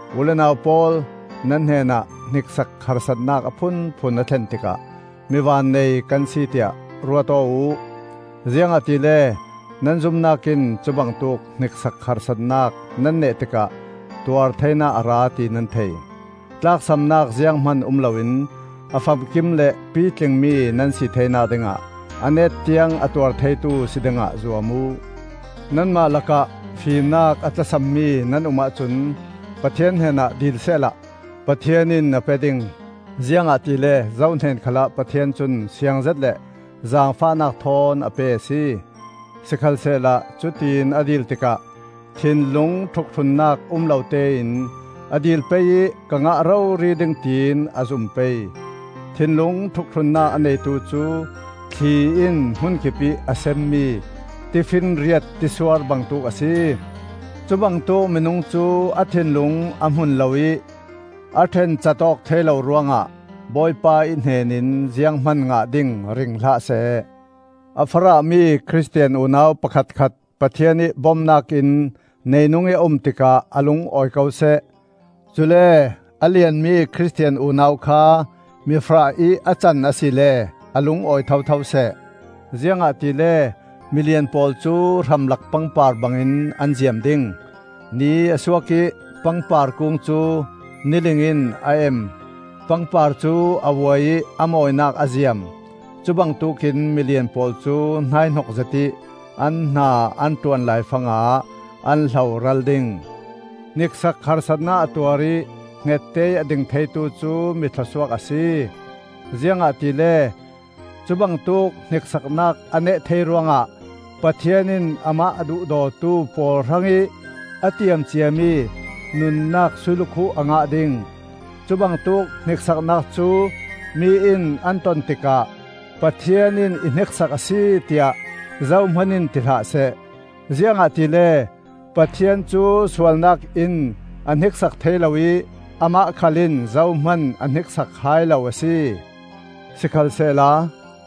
U le nau pawl, nan hnenah hniksak harsatnak a phunphun a thlen tikah mi vannei kan si tiah ruat aw uh; ziangahtile nan zumnak in cubangtuk hniksak harsatnak nan neh tikah tuar theinak a ra, ti nan thei. Tlaksamnak zianghman um loin a famkim le pitlingmi nan si theinak dingah a net tiang a tuar theitu si dingah zuam uh. Nanmah lakah fimnak a tlasammi nan um ahcun Pathian hnenah dil sehla Pathian in a pe ding. Ziangahtile zo hnen khalah Pathian cun siangzet le zaangfahnak thawn a pe a si. Sikhalsehla cutiin a dil tikah thinlung ṭhukṭhunnak um lo tein a dil pei ih ka ngah rori ding tiin a zum pei. Thinlung ṭhukṭhunnak a neitu cu thli in hmun kipih a semmi tifinriat tisuar bangtuk a si. Cubangtuk minung cu a thinlung a hmun lo ih a ṭhencat awk thei lo ruangah Bawipa ih hnen in zianghman ngah ding ring hlah seh. A farahmi Khristian unau pakhatkhat Pathian ih bomnak in neinungih a um tikah a lung awi ko seh. Cule a lianmi Khristian unau kha mi farahih a can asile a lung awi thotho seh. Ziangahtile milian pawl cu hramlak pangpar bangin an ziam ding. Ni a suak ih pangpar kung cu niling in a em; pangpar cu a vuai ih a mawinak a ziam. Cubangtuk in milian pawl cu hnaihnok zetih an hna an ṭuan laifangah an hloral ding. Hniksak harsatnak a tuar ih hngette ih a ding theitu cu mi thlawsuak a si. Ziangahtile cubangtuk hniksaknak a neh thei ruangah Pathian in amah a duhdawtu pawl hrangih a tiam ciami nunnak sui lukhuh a ngah ding. Cubangtuk hniksaknak cu mi in an ton tikah, “Pathian in i hniksak a si,” tiah zohman in ti hlah seh. Ziangahtile Pathian cu sualnak in a hniksak thei lo ih amah khal in zohman a hniksak hai lo a si. Sikhalsehla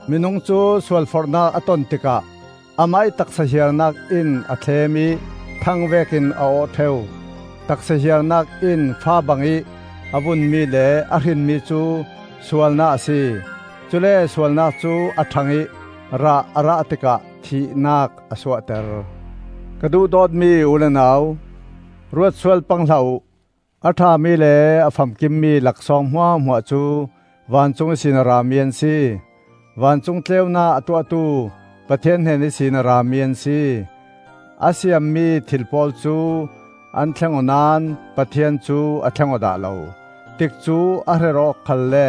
minung cu sualforhnak a ton tikah amah ih taksa hiarnak in a thlem ih thang vekin a awh ṭheu. Taksa hiarnak in fa bangih a vunmi le a hrinmi cu sualnak a si; cule sualnak cu a ṭhang ih rah a rah tikah thihnak a suahter. Ka duhdawtmi u le nau, ruat sual pang hlah uh. A ṭhami le a famkimmi laksawng hmuahhmuah cu vancung ihsin a rami an si. Vancung tleunak a tuahtu Pathian hnen ihsin a rami an si. A siammi thil pawl cu an thleng aw naón Pathian cu a thleng aw dah lo; tikcu a her awk khalle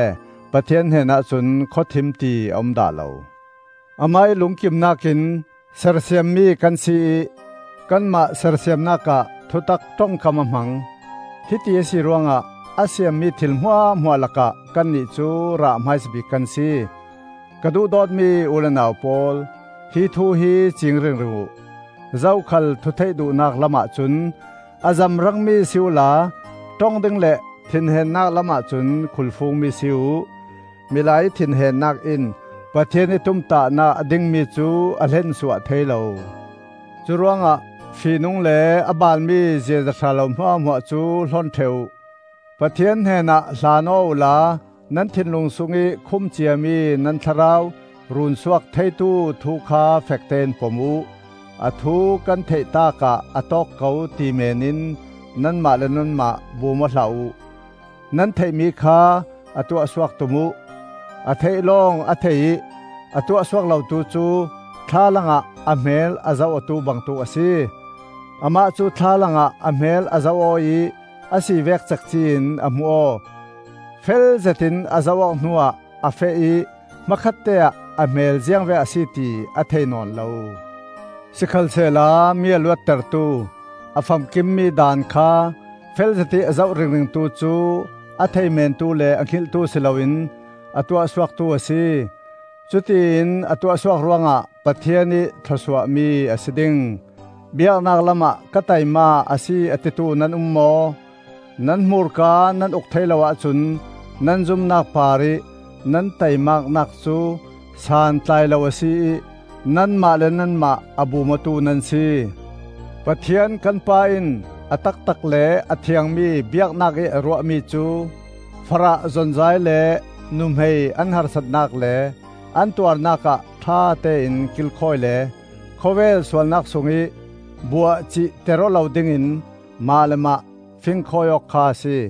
Pathian hnen ahcun khawthim ti a um dah lo. Amah ih lungkimnak in sersiammi kan si ih kanmah sersiamnak ah thutak ṭongkam a hmang. Hiti a si ruangah a siammi thil hmuahhmuah lakah kannih cu rah hmaisa bik kan si. Ka duhdawtmi u le nau pawl, hi thu hi cing ringring uh: zokhal thu theih duhnak lam ahcun a zamrangmi si uhla ṭong ding le thinhennak lam ahcun khulfungmi si uh. Milai ih thinhennak in Pathian ih tumtahnak a dingmi cu a hlensuah thei lo. Curuangah fihnung le a balmi ziaza ṭha lo hmuahhmuah cu hlon ṭheh uh. Pathian hnenah hlan aw uhla nan thinlung sungih khum ciami nan thlarau runsuak theitu thu kha fektein pom uh. A thu kan theih taakah a tawk ko ti meenin nanmah le nanmah bum aw hlah uh. Nan theihmi kha a tuahsuak tum uh. A theih lawng a thei ih a tuahsuak lotu cu thlalang ah a hmel a zoh awtu bangtuk a si. Amah cu thlalang ah a hmel a zoh aw ih a si vek cekci-in a hmu aw. Felzet in a zoh-awk hnuah a feh ih hmakhatte-ah a hmel ziangvek a si ti a thei nawn lo. Sikhalsehla mi a luattertu, a famkimmi daan kha felzetih a zoh ringringtu cu a thei mentu le a hngilhtu si loin a tuahsuaktu a si; cutiin a tuahsuak ruangah Pathian ih thlawsuahmi a si ding. Biaknak lamah ka taima a si a titu nan um maw? Nan hmurka nan uk thei lo ahcun nan zumnak parih nan taimaknak cu santlai lo a si ih nanmah le nanmah a bum awtu nan si. Pathian kan Pa in a taktak le a thiangmi biaknak ih a ruahmi cu: farah zonzai le nuhmei an harsatnak le an tuarnak ah ṭhatein kilkhawi le khawvel sualnak sungih buahcihter aw lo dingin mah le mah fingkhawi awk kha a si.